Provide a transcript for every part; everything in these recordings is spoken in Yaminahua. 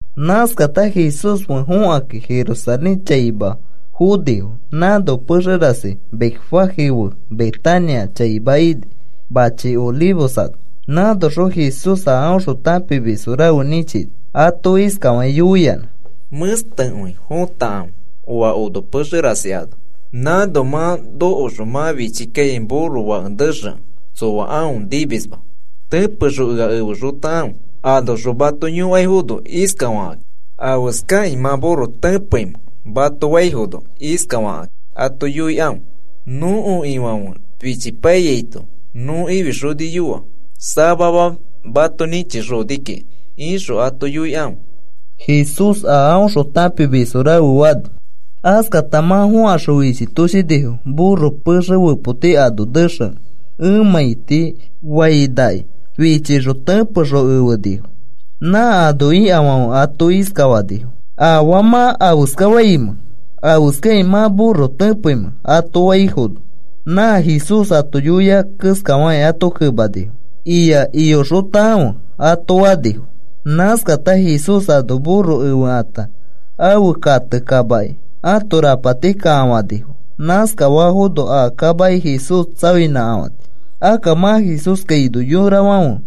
Nãskata Jesús fe fokakĩ Jerusalén chaima fonifo. Nãno pexe rasi Betfagé fe Betania chaima ini, machi Olivos ano. Nãnoxõ Jesús a aõxõ tãpimis rafe nĩchini. Ato iskafakĩ yoiyanã: “Mẽstekõi fotakãfe oa ono pexe rasi ano. Nãno mã nokoxõ mã fichi kaikai burro fake nexekẽ tsoa aõ nimisma. Tẽpexõ ea efexotakãfe. Anoxõ mato yõkaifono iskafakaki: ‘¿Afeskakĩ mã burro tẽpeimẽ?’ mato faifono, iskafakĩ ato yoikãfe: ‘Nõko Ifãfe fichipaiyaito nõ ifixoniyoa, samama mato nĩchixoni kiki,’ ixõ ato yoikãfe,” Jesús a aõxõ tãpimis rafe fani. Askata mã fõkaxõ fichitoshinifo burro pexe fepoti ano nexekẽ emãiti fainaki fichixõ tẽpexõ efenifo. Nã ano ikafãfe ato iskafanifo: “¿Afaa mã afeskafaimẽ? ¿Afeskakĩ mã burro tẽpeimẽ?” ato faifono, nã Jesús ato yoia keskafakĩ ato kemanifo: “Ia. Iyoxotakãfe,” ato fanifo. Nãskata Jesús ano burro efekãta, ãfe kate kamaki ãto rapati kakafanifo. Nãskafafono a kamaki Jesús tsaoinãkafãni. Akka mã Jesús kaino yorafãfe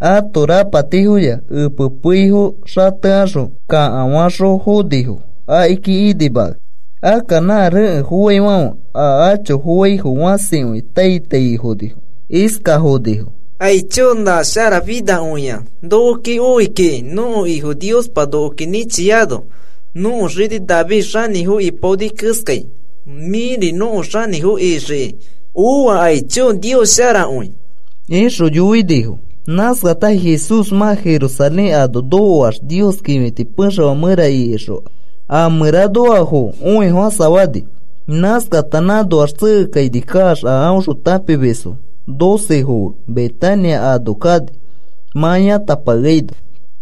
ãto rapatifoya epe peifo xatekaxõ kakafaxõ fonifo akiki inimakakĩ. Akka nã rekẽ foaifãfe a acho foaifo fãsikõi tai taifonifo. Iskafa fonifo: “¡Aicho, nã sharafinakõia nokoki oi kiki, nõko Ifo Niospa nokoki nĩchiano! Nõko xini David xanĩfo ipaoni keskai, mĩri nõko xanĩfo ixiki oa. ¡Aicho! ¡Nios sharakõi!” ixõ yoinifo. Nãskata Jesús mã Jerusalén ano nokoax, Nios kĩfiti pexefã mẽra ikixõ, a mẽranoafo õifofãsafani. Nãskata nãnoax tsekekaini kaax a aõxõ tãpimisfo docefo fe Betania ano kani, mã yãtapakeaino.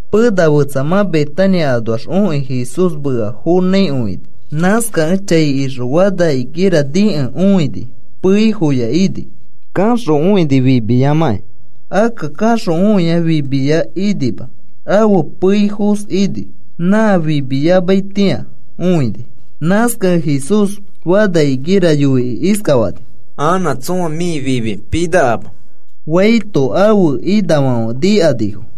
Pena fetsa mã Betania anoax okĩ Jesús mea fonãikõi fini. Nãskakẽ chai ixõ fana higo nikẽ õini, peifoya ini. Kaxõ õini fimiyamakĩ, akka kaxõ õia fimiya inima ãfe peifos ini. Nã fimiyamaitĩa õini. Nãskakẽ Jesús fana higo yoikĩ iskafani: “Anã tsõa mĩ fimi pinakama,” faito, ãfe inafãfe nikanifo.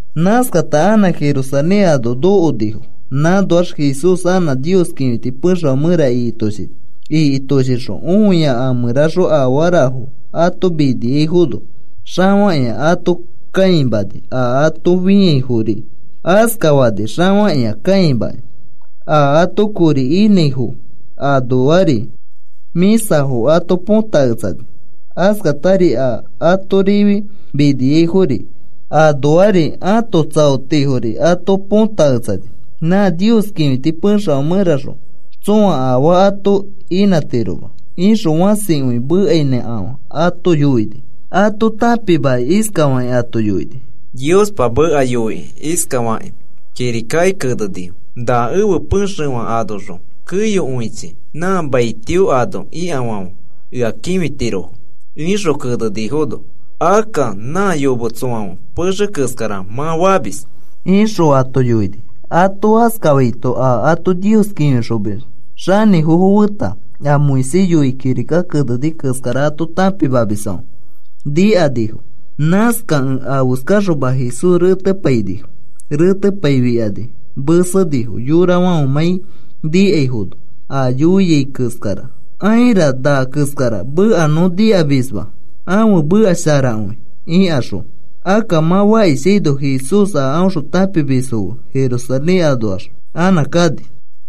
Nãskata anã Jerusalén ano nokonifo. Nãnoax Jesús anã Nios kĩfiti pexefã mẽra ikitoshini. Ikitoshixõ õia a mẽraxõ afarafo ato miniaifono xafakĩa ato kãimani, a ato fĩaifori askafani xafakĩa kãimakĩ. A ato kori inãifo anoari mĩsafo ato põtaketsani, askatari a ato rifi miniaifo anoari ãto tsaotifori ato põtaketsani. “Nã Nios kĩfiti pexefã mẽraxõ tsõa afaa ato inãtiroma,” ixõ fãsi mekainãkafã ato yoini. Ato tãpimakĩ iskafakĩ ato yoini: “Niospa meka yoikĩ iskafakĩ kirikaki kenenifo: ‘Na ẽfe pexefã anoxõ keyokõichi nã maitio ano ikafãfe ea kĩfitirofo,’ ixõ kenefinifono, akka nã yometsofãfe pexe keskara mã famis,” ixõ ato yoini. Ato askafaito, a ato Nios kĩfixomis xanĩfofo feta, a Moisés yoikĩ kirika keneni keskara ato tãpimamisfãfe nikanifo. Nãskakẽ afeskaxoma Jesús retepainifo, retepaifikani mesenifo, yorafãfemãi nikakõiaifono a yoiai keskara, “Aira, na keskara meka nõ nikamisma, ãfe meka sharakõi,” ikaxõ. Akka mã fakishaino Jesús a aõxõ tãpimisfo fe Jerusalén anoax anã kani.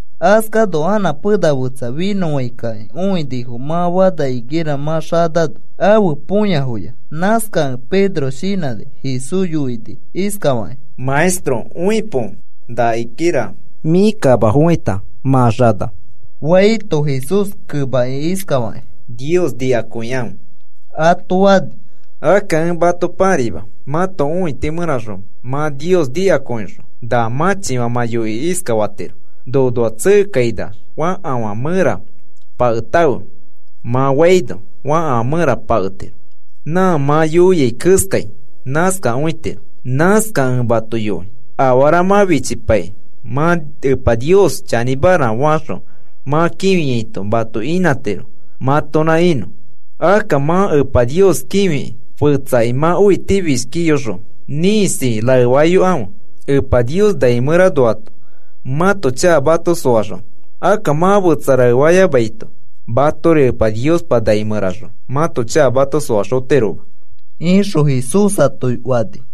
Askano anã pena fetsa finõfãikakĩ õinifo, nã fana higuera mã xanano ãfe tapofoya. Nãskakẽ Pedro shinãkĩ Jesús yoini iskafakĩ: “Maestro, õipo na higuera mĩ kamafofãita mã xana,” faito, Jesús kemakĩ iskafakĩ: “Nios nikakõikãfe,” ato fani. “Akka ẽ mato pãraima. Mãto õiti mẽraxõ mã Nios nikakõixõ na mãchifã mã yoikĩ iskafatiro: ‘Nonoax tsekekainax fakafã mẽra paketãfe,’ mã faino fakafã mẽra paketiro. Nã mã yoiai keskai nãskakõitiro. Nãskakẽ ẽ mato yoi, afara mã fichipaikĩ mã Epa Nios chanĩmara faxõ mã kĩfiaito mato inãtiro, mãtonã inõ. Akka mã Epa Nios kĩfikĩ, fetsaki mã õitifishki iyoxõ ĩkisi raefayokãfe, Epa Nios nai mẽranoato mãto chaka mato soaxonõ. Akka mã fetsafo raefayamaito, matori Epa Niospa nai mẽraxõ mãto chakafo mato soaxotiroma,” Jesús ato fani.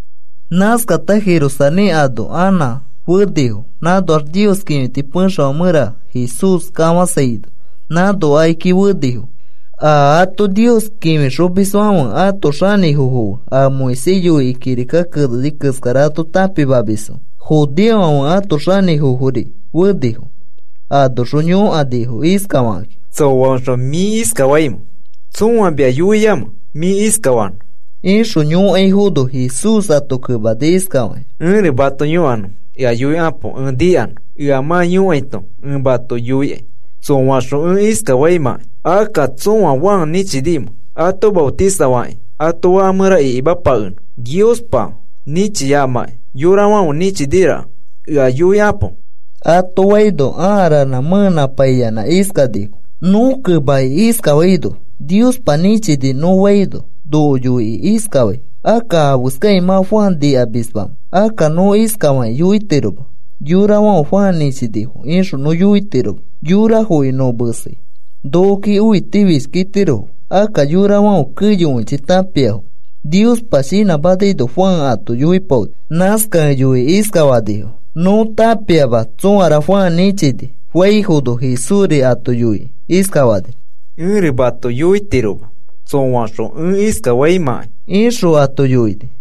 Nãskata Jerusalén ano anã fenifo. Nãnoax Nios kĩfiti pexefã mẽra Jesús kafãsaino, nãno akiki fenifo. A ato Nios kĩfixomisfãfe ãto xanĩfofo fe, a Moisés yoikĩ kirika keneni keskara ato tãpimamisfo, judeofãfe ãto xanĩfofori fenifo. Anoxõ yõkanifo iskafakakĩ: “¿Tsõaõxõ mĩ iskafaimẽ, tsõa mia yoiamẽ mĩ iskafanõ?” ixõ yõkaifono, Jesús ato kemani iskafakĩ: “Ẽri mato yõkanõ ea yoikapo ẽ nikanõ. Ea mã yoiaito ẽ mato yoikai tsõaõxõ ẽ iskafaimãkai. Akka, ¿tsõa Juan nĩchinimẽ ato maotisafakĩ ato faka mẽra ikimapakenõ? Niospa nĩchiyamakĩ yorafãfe nĩchiniforaka ea yoikapo,” ato faino ãa ranã mẽenãpaiyanã iskanifo: “Nõ kemakĩ iskafaino: ‘Niospa nĩchini,’ nõ faino noko yoikĩ iskafai: ‘Akka, ¿afeskakĩ mã Juan nikamismamẽ?’ Akka nõ iskafakĩ yoitiroma: ‘Yorafãfe Juan nĩchinifo,’ ixõ nõ yoitiroma, yorafoki nõ mesei nokoki õitifishki itirofo.” Akka yorafãfe keyokõichi tãpiafo Niospa shinãmanaino Juan ato yoipaoni. Nãskakẽ yoikĩ iskafanifo: “Nõ tãpiama tsõara Juan nĩchini,” faifono, Jesúsri ato yoikĩ iskafani: “Ẽri mato yoitiroma tsõaõxõ ẽ iskafaimãkai,” ixõ ato yoini.